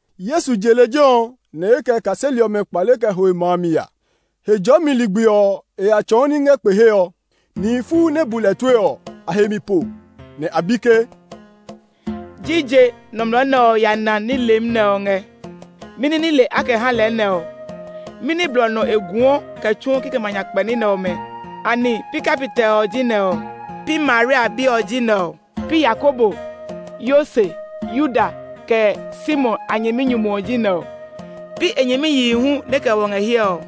Yesu je lejɛ ɔ, nɛ e kɛ e kaseli ɔmɛ kpale kɛ ho e ma mi ya. Hejɔɔmi ligbi ɔ, e ya tsɔɔ ní ngɛ kpe he ɔ. Nihi fuu nɛ bu lɛ tue ɔ, a he mi po, nɛ a bi ke, “Jije nɔmlɔ nɛ ɔ ya ná nile nɛ ɔ ngɛ? Mɛni nile a kɛ ha lɛ nɛ ɔ? Mɛni blɔ nɔ e guɔ kɛ tsuɔ kikɛmɛ a nyakpɛ ní nɛ ɔmɛ? Anɛ pi kapitɛ ɔ ji nɛ ɔ? Pi Maria bi ɔ ji nɛ ɔ? Pi Yakobo, Yose, Yuda, kɛ Simon a nyɛminyumu ɔ ji nɛ ɔ? Pi e nyɛmiyihi hu nɛ kɛ wɔ ngɛ hiɛ ɔ?”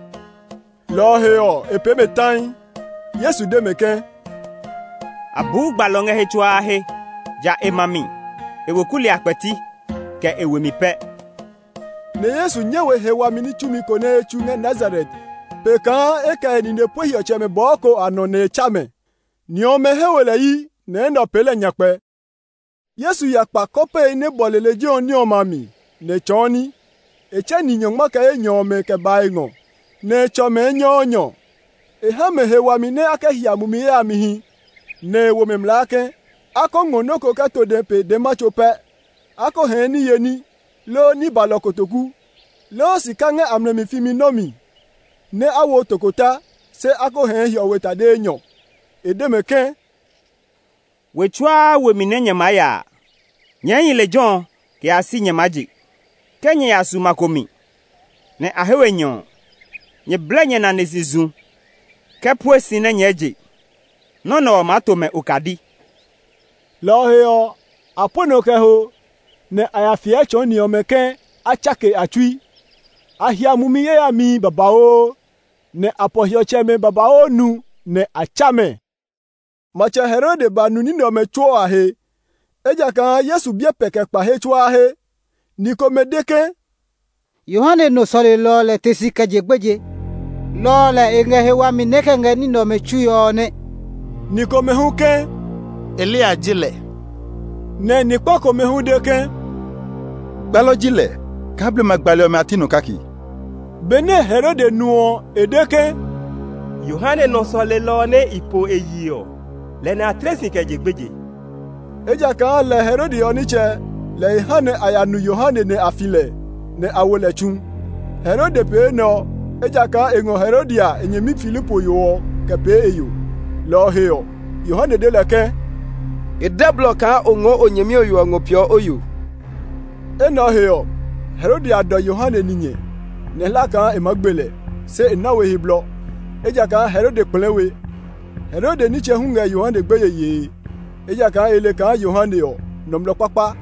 Lɔ ɔ he ɔ, e pee mɛ tai. Yesu de mɛ ke, “A buu gbalɔ ngɛ he tsuaa he, ja e ma mi, e weku li a kpɛti, kɛ e we mi pɛ.” Nɛ Yesu nyɛ we he wami ní tsumi ko nɛ e tsu ngɛ Nazaret pe kaa e kɛ e nine pue hiɔtsɛmɛ bɔɔ ko a nɔ nɛ e tsa mɛ. Ni ɔmɛ he we lɛ yi, nɛ enɛ ɔ pee lɛ nyakpɛ. Yesu ya kpa kɔpehi nɛ bɔle lejɛ ɔ ní ɔmɛ a mi, nɛ e tsɔɔ ní. E tsɛ ni nyɔngma kɛ enyɔ ɔmɛ kɛ ba e ngɔ, nɛ e tsɔ mɛ enyɔɔnyɔ. E ha mɛ he wami nɛ a kɛ hia mumi yayamihi. Nɛ e wo mɛ mlaa ke, a ko ngɔ nɔ́ ko kɛ to dɛ pe dɛma tso pɛ; a ko hɛɛ niye ní, loo ní balɔ kotoku, loo sika ngɛ a mlɛ mi fimi nɔ́ mi. Nɛ a wo tokota, se a ko hɛɛ hiɔwe tade enyɔne. E de mɛ ke, “We tsuaa we mi nɛ nyɛ maa ya a, nyɛɛ hi lejɛ ɔ kɛ yaa si nyɛ maa je. Ke nyɛ ya su ma ko mi, nɛ a he we nyɛ ɔ, nyɛ blɛ nyɛ nane si zu kɛ pue si nɛ nyɛɛ je! Nɔ́ nɛ ɔ maa to mɛ okadi!” Lɔ ɔ he ɔ, a pue nɔ kɛ ho, nɛ a ya fiɛ tsɔɔ ni ɔmɛ ke a tsake a tsui. A hia mumi yayamihi babauu, nɛ a pɔ hiɔtsɛmɛ babauu nu, nɛ a tsa mɛ. Matsɛ Herode ba nu ní nɛ ɔmɛ tsuo a he, ejakaa Yesu biɛ pɛ kɛ kpa he tsuaa he. Ni komɛ de ke, “Yohane nɔ sɔlelɔ ɔ lɛ te si kɛ je gbeje, lɔ ɔ lɛ e ngɛ he wami nɛ e kɛ ngɛ ní nɛ ɔmɛ tsue ɔ nɛ.” Ni komɛ hu ke, “Eliya ji lɛ;” nɛ ni kpa komɛ hu de ke, “Gbalɔ ji lɛ kaa blema gbali ɔmɛ a ti nɔ kake.” Benɛ Herode nu ɔ, e de ke, “Yohane nɔ sɔlelɔ ɔ nɛ i po e yi ɔ, lɛ nɛ a tle si kɛ je gbeje.” Ejakaa lɛ, Herode ɔ nitsɛ lɛ e ha nɛ a ya nu Yohane nɛ a fi lɛ, nɛ a wo lɛ tsu. Herode pee enɛ ɔ, ejakaa e ngɔ Herodia, e nyɛmi Filipo yo ɔ kɛ pee e yo. Lɔ ɔ he ɔ, Yohane de lɛ ke, “E dɛ blɔ kaa o ngɔɔ o nyɛmi ɔ yo ɔ ngɔ peeɔ o yo.” Enɛ ɔ he ɔ, Herodia dɔ Yohane ninyɛ, nɛ e hlaa kaa e maa gbe lɛ, se e na we he blɔ, ejakaa Herode kplɛɛ we. Herode nitsɛ hu ngɛ Yohane gbeye yee, ejakaa e le kaa Yohane ɔ, nɔmlɔ kpakpa,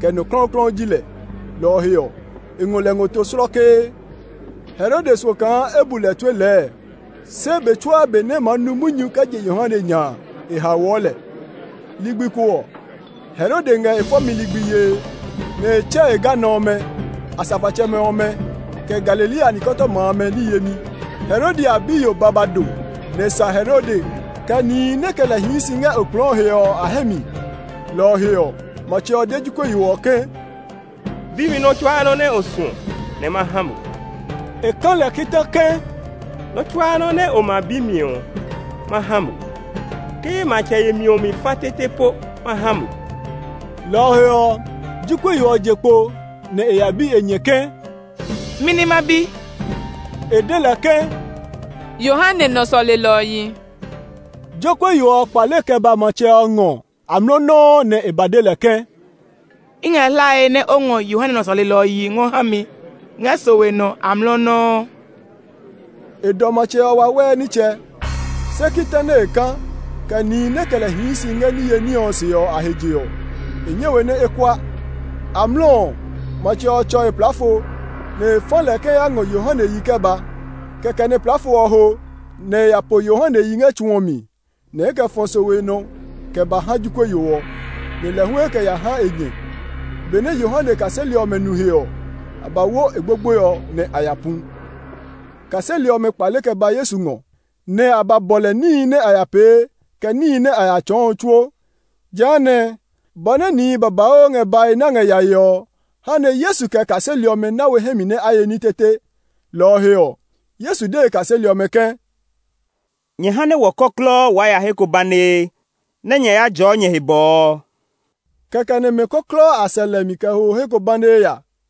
kɛ nɔ klɔuklɔu ji lɛ; lɔ ɔ he ɔ, e ngɔ lɛ ngɔ to slɔkee. Herode suɔ kaa e bu lɛ tue lɛɛ, se be tsuaa be nɛ e maa nu munyu kɛ je Yohane nya, e haoɔ lɛ. Ligbi ko ɔ, Herode ngɛ e fɔmi ligbi yee, nɛ e tsɛ e ganɔ ɔmɛ, asafoatsɛmɛ ɔmɛ, kɛ Galilea nikɔtɔma amɛ ní yemi. Herodia biyo ba ba do, nɛ e sa Herode, kɛ nihi nɛ kɛ lɛ hii si ngɛ okplɔɔ he ɔ a hɛ mi. Lɔ ɔ he ɔ, matsɛ ɔ de jokuɛ yo ɔ ke, “Bi mi nɔ́ tsuaa nɔ́ nɛ o suɔ nɛ ma ha mo!” E ka lɛ kita ke, “Nɔ́ tsuaa nɔ́ nɛ o ma bi mi ɔ, ma ha mo; ke ye matsɛ yemi ɔ mi fa tete po ma ha mo!” Lɔ ɔ he ɔ, jokuɛ yo ɔ je kpo nɛ e ya bi e nyɛ ke, “Mɛni ma bi?” E de lɛ ke, “Yohane nɔ sɔlelɔ ɔ yi!” Jokuɛ yo ɔ kpale kɛ ba matsɛ ɔ ngɔ amlɔ nɔuu nɛ e ba de lɛ ke, “I ngɛ hlae nɛ o ngɔ Yohane nɔ sɔlelɔ ɔ yi ngɔ ha mi ngɛ sowe nɔ amlɔ nɔuu.” E dɔ matsɛ ɔ wawɛɛ nitsɛ, se kita nɛ e ka, kɛ nihi nɛ kɛ lɛ hii si ngɛ niye ní ɔ si ɔ a he je ɔ, e nyɛ we nɛ e kua. Amlɔ ɔ, matsɛ ɔ tsɔ e plaafo, nɛ e fa lɛ ke e ya ngɔ Yohane yi kɛ ba. Kɛkɛ nɛ plaafo ɔ ho nɛ e ya po Yohane yi ngɛ tsu ɔ mi, nɛ e kɛ fɔ sowe nɔ kɛ ba ha jokuɛ yo ɔ, nɛ lɛ hu e kɛ ya ha e nyɛ. Benɛ Yohane kaseli ɔmɛ nu he ɔ, a ba wo e gbogboe ɔ nɛ a ya pu. Kaseli ɔmɛ kpale kɛ ba Yesu ngɔ, nɛ a ba bɔ lɛ níhi nɛ a ya pee, kɛ níhi nɛ a ya tsɔɔ ɔ tsuo. Jehanɛ, bɔ nɛ nihi babauu ngɛ bae nɛ a ngɛ yae ɔ ha nɛ Yesu kɛ e kaseli ɔmɛ na we hɛ mi nɛ a ye ní tete. Lɔ ɔ he ɔ, Yesu de e kaseli ɔmɛ ke, “Nyɛ ha nɛ wɔ kɔklɔɔ waa ya he ko banee nɛ nyɛ ya jɔɔ nyɛ he bɔɔ.” Kɛkɛ nɛ mɛ kɔklɔɔ a sɛ lɛ mi kɛ ho he ko banee ya.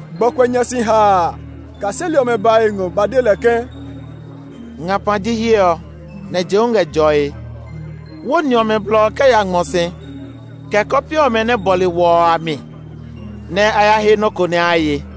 Gbɔkuɛ nya si haa a, kaseli ɔmɛ ba e ngɔ ba de lɛ ke, “Ngapa ji hiɛ ɔ, nɛ je hu ngɛ jɔe. Wó ni ɔmɛ blɔ kɛ ya ngmɔ si, kɛ kɔpe ɔmɛ nɛ bɔle wɔ ɔ a mi, nɛ a ya he nɔ́ ko nɛ a ye.”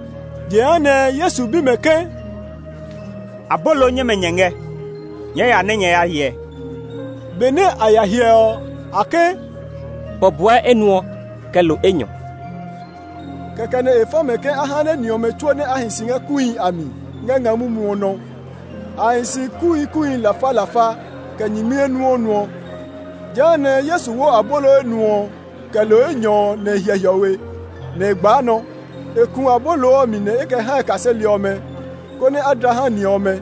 Jehanɛ Yesu bi mɛ ke, “Abolo nyɛmɛ nyɛ ngɛ? Nyɛɛ ya nɛ nyɛ ya hyɛ.” Benɛ a ya hyɛ ɔ, a ke, “Bɔbɔɛ enuɔ, kɛ lo enyɔ.” Kɛkɛ nɛ e fa mɛ ke a ha nɛ ni ɔmɛ tsuo nɛ a hi si ngɛ kuuhi a mi ngɛ nga mumu ɔ nɔ. A hi si kuuhi kuuhi lafalafa kɛ nyingmi enuɔɔnuɔ. Jehanɛ Yesu wo abolo enuɔ ɔ kɛ lo enyɔ ɔ nɛ e hyɛ hiɔwe, nɛ e gbaa nɔ. E ku abolo ɔ mi nɛ e kɛ ha e kaseli ɔmɛ, konɛ a dla ha ni ɔmɛ.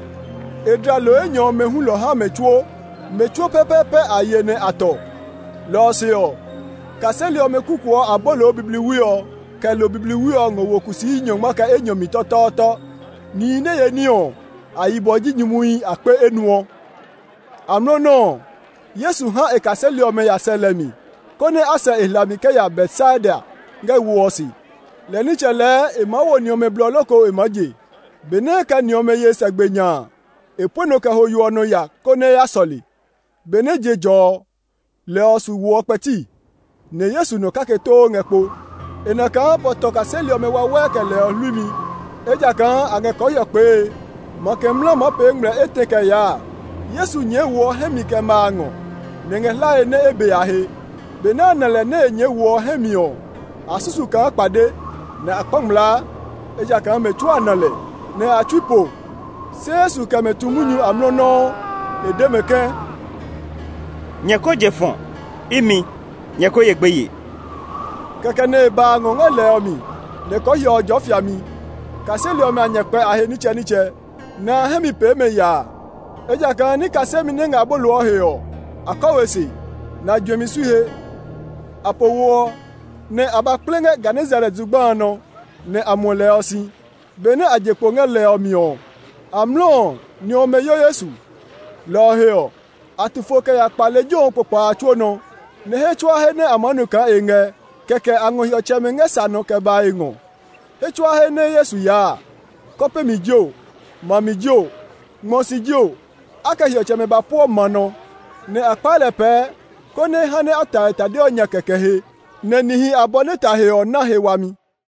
E dla lo enyɔ ɔmɛ hulɔ ha mɛ tsuo. Mɛ tsuo pɛpɛɛpɛ a ye nɛ a tɔ. Lɔ ɔ se ɔ, kaseli ɔmɛ kukuɔ abolo bibliwi ɔ kɛ lo bibliwi ɔ ngɔ wo kusii nyɔngma kɛ enyɔ mi tɔtɔɔtɔ. Nihi nɛ ye ní ɔ, a yibɔ ji nyumuhi akpe enuɔ. Amlɔ nɔuu ɔ, Yesu ha e kaseli ɔmɛ ya sɛ lɛ mi, konɛ a sɛ e hlami kɛ ya Betsaida ngɛ wo ɔ se; lɛ nitsɛ lɛɛ e maa wo ni ɔmɛ blɔ loko e maa je. Benɛ e kɛ ni ɔmɛ ye sɛ gbe nya a, e pue nɔ kɛ ho yo ɔ nɔ ya konɛ e ya sɔle. Benɛ je jɔ ɔ, lɛ ɔ su wo ɔ kpɛti, nɛ Yesu nɔ kake too ngɛ kpo. E na kaa pɔ tɔ kaseli ɔmɛ wawɛɛ kɛ lɛ ɔ hluimi; ejakaa a ngɛ kɔɔhiɔ kpee. Makɛ mla maa pee ngmlɛ etɛ kɛ yaa a, Yesu nyɛɛ wo ɔ hɛ mi kɛ ma a ngɔ; nɛ e ngɛ hlae nɛ e be a he. Benɛ a na lɛ nɛ e nyɛɛ wo ɔ hɛ mi ɔ, a susu kaa kpade, nɛ a kpa ngmlaa; ejakaa mɛ tsuo a na lɛ, nɛ a tsui po. Se Yesu kɛ mɛ tu munyu amlɔ nɔuu; e de mɛ ke, “Nyɛ ko je fɔ̃; imi; nyɛ ko ye gbeye!” Kɛkɛ nɛ e ba a ngɔ ngɛ lɛ ɔ mi; nɛ kɔɔhiɔ ɔ jɔɔ fiami. Kaseli ɔmɛ a nya kpɛ a he nitsɛnitsɛ, nɛ a hɛ mi pee mɛ yaa; ejakaa ní kasemi nɛ ngɛ abolo ɔ he ɔ, a kɔ we se, nɛ a juɛmi sui he. A po wo ɔ, nɛ a ba kple ngɛ Genesaret zugba a nɔ; nɛ a muɔ lɛ ɔ si. Benɛ a je kpo ngɛ lɛ ɔ mi ɔ, amlɔ ɔ, ni ɔmɛ yo Yesu. Lɔ ɔ he ɔ, a tu fo kɛ ya kpa lejɛ ɔ kpokpa a tsuo nɔ, nɛ he tsuaa he nɛ a maa nu kaa e ngɛ kɛkɛ a ngɔ hiɔtsɛmɛ ngɛ sa nɔ kɛ ba e ngɔ. He tsuaa he nɛ Yesu ya a, kɔpe mi jio, ma mi jio, ngmɔ si jio, a kɛ hiɔtsɛmɛ ba pueɔ ma nɔ, nɛ a kpaa lɛ pɛɛ konɛ e ha nɛ a ta e tade ɔ nya kɛkɛ he; nɛ nihi abɔ nɛ ta he ɔ na he wami.